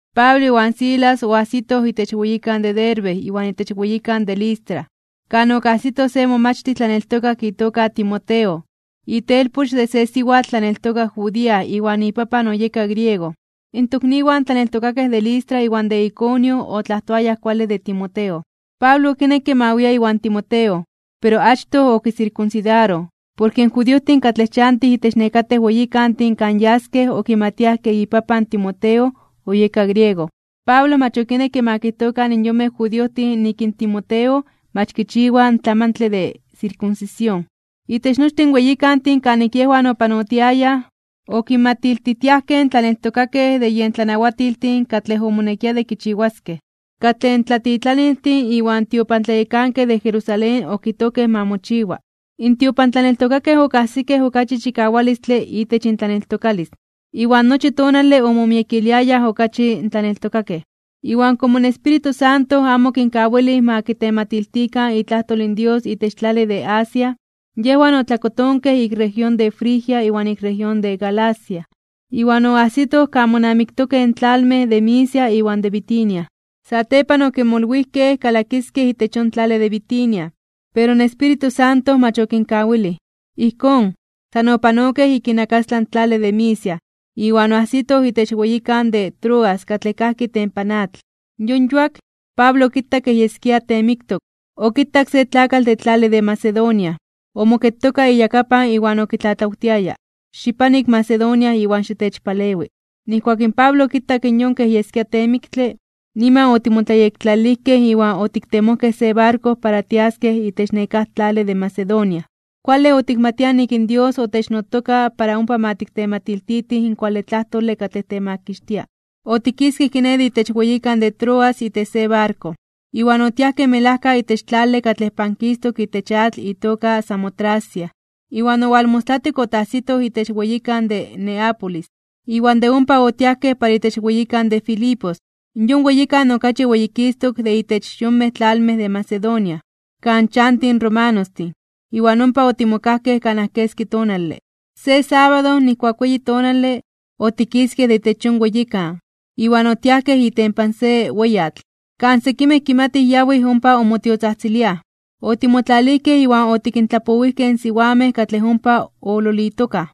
Pablo iwan Silas oajsitoj itech weyikan de Derbe iwan itech weyikan de Listra, kan okajsitoj se momachtij tlaneltokak itoka Timoteo, itelpoch de se siwatl tlaneltokak judía iwan ipapan oyeka griego. In tokniwan tlaneltokakej de Listra iwan de Iconio otlajtoayaj kuale de Timoteo. Pablo okinekke ma wia iwan Timoteo, pero achtoj okisirkunsidaroj porke in judiojtin katlej chantij itech nekatej weyikantin kan yaskej okimatiaj ke ipapan in Timoteo oyeka griego. Pablo mach okinekke ma kijtokan in yonmej judiojtin nik in Timoteo mach kichiwa in tlamantle de sirkunsisión. Itech nochtin weyikantin kanik yejwan opanotiayaj, okinmatiltijtiajkej in tlaneltokakej de yen tlanawatiltin katlej omonekia de kichiwaskej, katlej in tlatitlaniltin iwan tiopantlayekankej de Jerusalén okijtojkej ma mochiwa. In tiopantlaneltokakej okajsikej okachi chikawalistle itech intlaneltokalis, iwan nochi tonale omomiekiliayaj okachi in tlaneltokakej. Iwan komo in Espíritu Santo amo okinkawilij ma kitematiltikan itlajtol in Dios itech tlale de Asia, yejwan otlakotonkej ik región de Frigia iwan ik región de Galacia, iwan oajsitoj kan monamiktokej in tlalmej de Misia iwan de Bitinia. Satepan okimolwijkej kalakiskej itech yon tlale de Bitinia, pero in Espíritu Santo mach okinkawilij. Ijkón, san opanokej ik inakastlan in tlale de Misia, iwan oajsitoj itech weyikan de Troas katlej kajki itempan atl. Yon yuak, Pablo okitak kej yeskia teemiktok, okitak se tlakatl de tlale de Macedonia, omoketoka iyakapan iwan okitlatlawtiaya: “Xipano ik Macedonia iwan xitechpalewi.” Nijkuak in Pablo okitak in yon kej yeskia teemiktle, niman otimotlayektlalilijkej iwan otiktemojkej se barko para tiaskej itech nekáj tlale de Macedonia, kuale otikmatiaj nik in Dios otechnotoka para ompa ma tiktematiltitij in kuale tlajtole katlej temakixtia. Otikiskej kiné de itech weyikan de Troas itech se barko, iwan otiajkej melajka itech tlale katlej pankistok itech atl itoka Samotracia, iwan owalmostlatik otajsitoj itech weyikan de Neápolis. Iwan de ompa otiajkej para itech weyikan de Filipos, yon weyikan okachi weyikistok de itech yonmej tlalmej de Macedonia, kan chantij romanostin, iwan ompa otimokajkej kanaj keski tonale. Se sábado, nijkuak weyi tonale, otikiskej de itech yon weyikan, iwan otiajkej itempan se weyatl, kan sekimej kimatij yawij ompa onmotiotzajtziliaj. Otimotlalijkej iwan otikintlapowijkej in siwamej katlej ompa oololitokaj.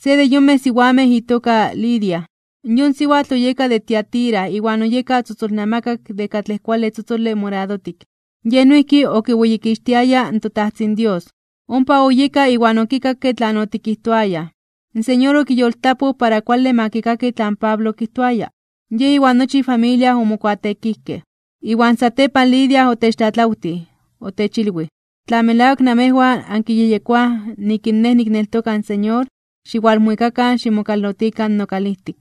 Se de yonmej siwamej itoka Lidia. Yon siwatl oyeka de Tiatira iwan oyeka tzotzolnamakak de katlej kuale tzotzole moradotik. Yej noijki okiweyikixtiaya in toTajtzin Dios. Ompa oyeka iwan okikakke tlan otikijtoayaj, in Señor okiyoltlapoj para kuale ma kikaki tlan Pablo okijtoaya. Yej iwan nochi ifamilia omokuateekijkej. Iwan satepan Lidia otechtlatlawtij. Otechilwij: ―Tla melawak namejwan ankiyejyekoaj nik in nej nikneltoka in Señor, xiwalmuikakan ximokalotikan nokalijtik.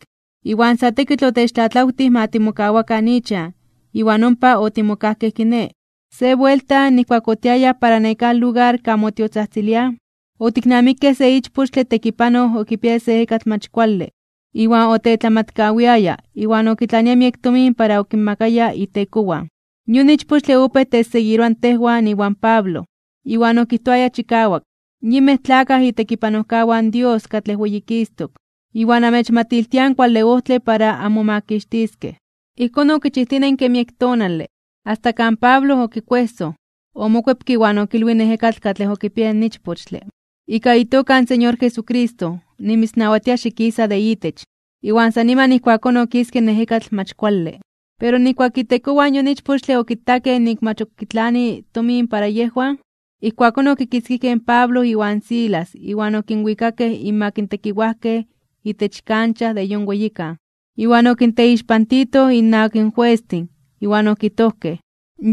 Iwan sa tekitl otechtlatlawtij ma timokawakan ichan, iwan ompa otimokajkej kiné. Se buelta, nijkuak otiayaj para nekáj lugar kan motiotzajtziliaj, otiknamikej se ichpochtle tekipanoj okipiaya se ejekatl mach kuale iwan otetlamatkawiaya iwan okitlania miek tomin para okinmakaya itekowan. Yon ichpochtle opéj techseguiroa tejwan iwan Pablo, iwan okijtoaya chikawak: ―Yinmej tlakaj itekipanojkawan Dios katlej Weyikistok (Weyititok) iwan amechmatiltiaj in kuale ojtle para anmomakixtiskej. Ijkón okichijtinenke miek tonale, asta kan Pablo okikuejsoj, omokuepke iwan okilwij in ejekatl katlej okipiaya in ichpochtle: ―Ika itoka in Señor Jesucristo, nimitznawatia xikisa de itech. Iwan san niman ijkuakón okiske in ejekatl mach kuale. Pero nijkuak itekowan yon ichpochtle okitakej nik mach ok kitlani tomin para yejwan, ijkuakón okinkitzkijkej in Pablo iwan Silas iwan okinwikakej inmak in tekiwajkej itech kancha de yon weyikan. Iwan okinteixpantitoj innawak in juestin, iwan okijtojkej: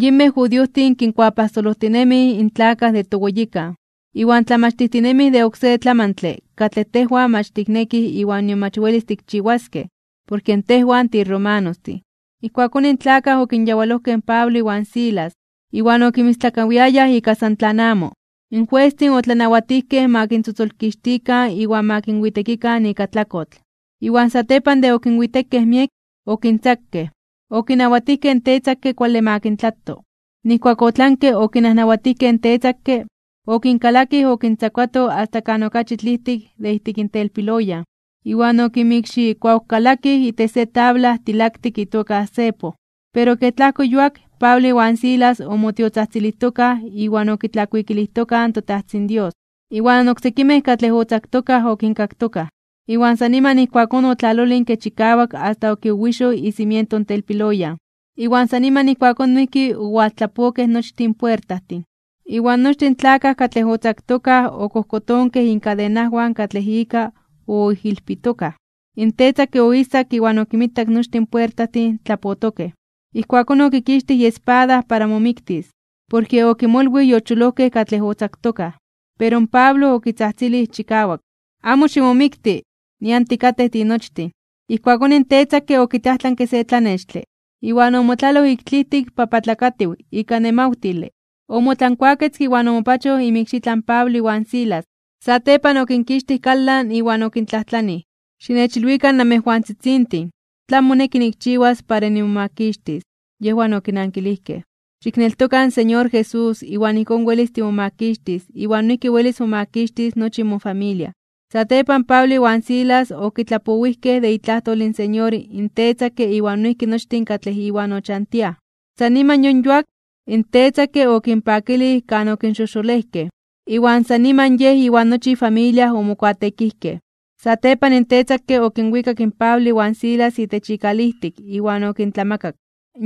―Yinmej judiojtin kinkuapajsolojtinemij (kinkuatlapololtijtinemij) in tlakaj de toweyikan, iwan tlamachtijtinemij de oksé tlamantle katlej tejwan mach tiknekij iwan nion mach welis tikchiwaskej, porke tejwan tiromanostin. Ijkuakón in tlakaj okinyawalojkej in Pablo iwan Silas iwan okinmistlakawiayaj ika san tlan amo. In juestin otlanawatijkej ma kintzotzolkixtikan iwan ma kinwitekikan ika tlakotl. Iwan satepan de okinwitekej miek, okintzakej. Okinawatijkej in tetzakke kuale ma kintlato. Nijkuak otlanke okinajnawatijkej in tetzakke, okinkalakij okintzakuato asta kan okachi tlijtik de ijtik telpiloyan, iwan okinmikxikuawkalakij itech se tabla tilaktik itoka cepo. Pero kej tlajko yuak, Pablo iwan Silas omotiotzajtzilijtokaj iwan okitlakuikilijtokaj in toTajtzin Dios, iwan oksekimej katlej otzaktokaj okinkaktokaj, iwan san niman ijkuakón otlalolinke chikawak asta okiwiwixoj icimiento in telpiloyan, iwan san niman ijkuakón noijki owaltlapokej nochtin puertajtin. Iwan nochtin in tlakaj katlej otzaktokaj okojkotonkej inkadenawan katlej ika oijilpitokaj. In tetzakke oijsak iwan okinmitak nochtin in puertajtin tlapotokej. Ijkuakón okikixtij iespada para momiktis, porke okimolwij yocholojkej katlej otzaktokaj. Pero in Pablo okitzajtzilij chikawak: ―¡Amo ximomikti! Nian tikatej tinochtin. Ijkuakón in tetzakke okitlajtlanke se tlanextle, iwan omotlaloj ik tlijtik papatlakatiw (bibiokatiw) ika nemawtile, omotlankuaketzke iwan omopachoj inmikxitlan Pablo iwan Silas. Satepan okinkixtij kalan iwan okintlajtlanij: ―Xinechilwikan namejwantzitzintin, ¿tlan moneki nikchiwas para nimomakixtis? Yejwan okinankilijkej: ―Xikneltoka in Señor Jesús, iwan ijkón welis timomakixtis iwan noijki welis momakixtis nochi mofamilia. Satepan Pablo iwan Silas okitlapowijkej de itlajtol in Señor in tetzakke iwan noijki nochtin katlej iwan ochantiaj. San niman yon yuak, in tetzakke okinpakilij kan okinxojxolejkej, iwan san niman yej iwan nochi ifamilia omokuateekijkej. Satepan in tetzakke okinwikak in Pablo iwan Silas itech ikalijtik iwan okintlamakak.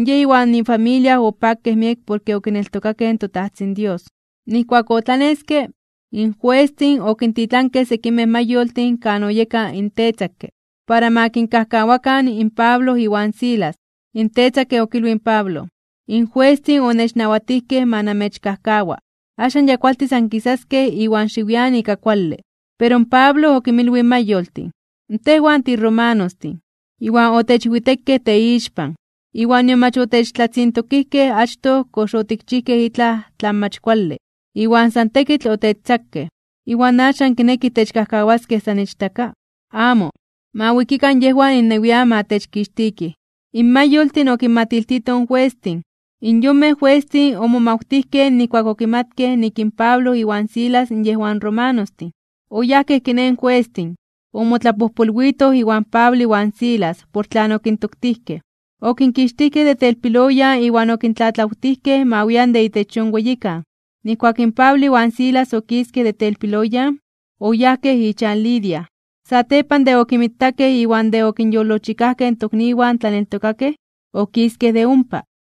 Yej iwan ifamilia opakej miek por okineltokakej in toTajtzin Dios. Nijkuak otlaneske, in juestin okintitlankej sekimej mayoltin kan oyeka in tetzakke, para ma kinkajkawakan in Pablo iwan Silas. In tetzakke okilwij in Pablo: ―In juestin onechnawatijkej ma namechkajkawa, axan ya kualtis ankisaskej iwan xiwian ika kuale. Pero in Pablo okinmilwij in mayoltin: ―Tejwan tiromanostin, iwan otechwitekej teixpan iwan nion mach otechtlatzintokijkej achtoj kox otikchijkej itlaj tlan mach kuale, iwan san tekitl otechtzakej. ¿Iwan axan kinekij techkajkawaskej san ichtaka? ¡Amo! Ma wikikan yejwan innewian ma techkixtikij. In mayoltin okinmatiltitoj in juestin. In yonmej juestin omomawtijkej nijkuak okimatkej nik in Pablo iwan Silas yejwan romanostin. Oyajkej kiné in juestin, omotlapojpolwitoj iwan Pablo iwan Silas por tlan okintoktijkej, okinkixtijkej de telpiloyan iwan okintlatlawtijkej ma wian de itech yon weyikan. Nijkuak in Pablo iwan Silas okiskej de telpiloyan, oyajkej ichan Lidia. Satepan de okinmitakej iwan de okinyolojchikajkej in tokniwan tlaneltokakej, okiskej de ompa.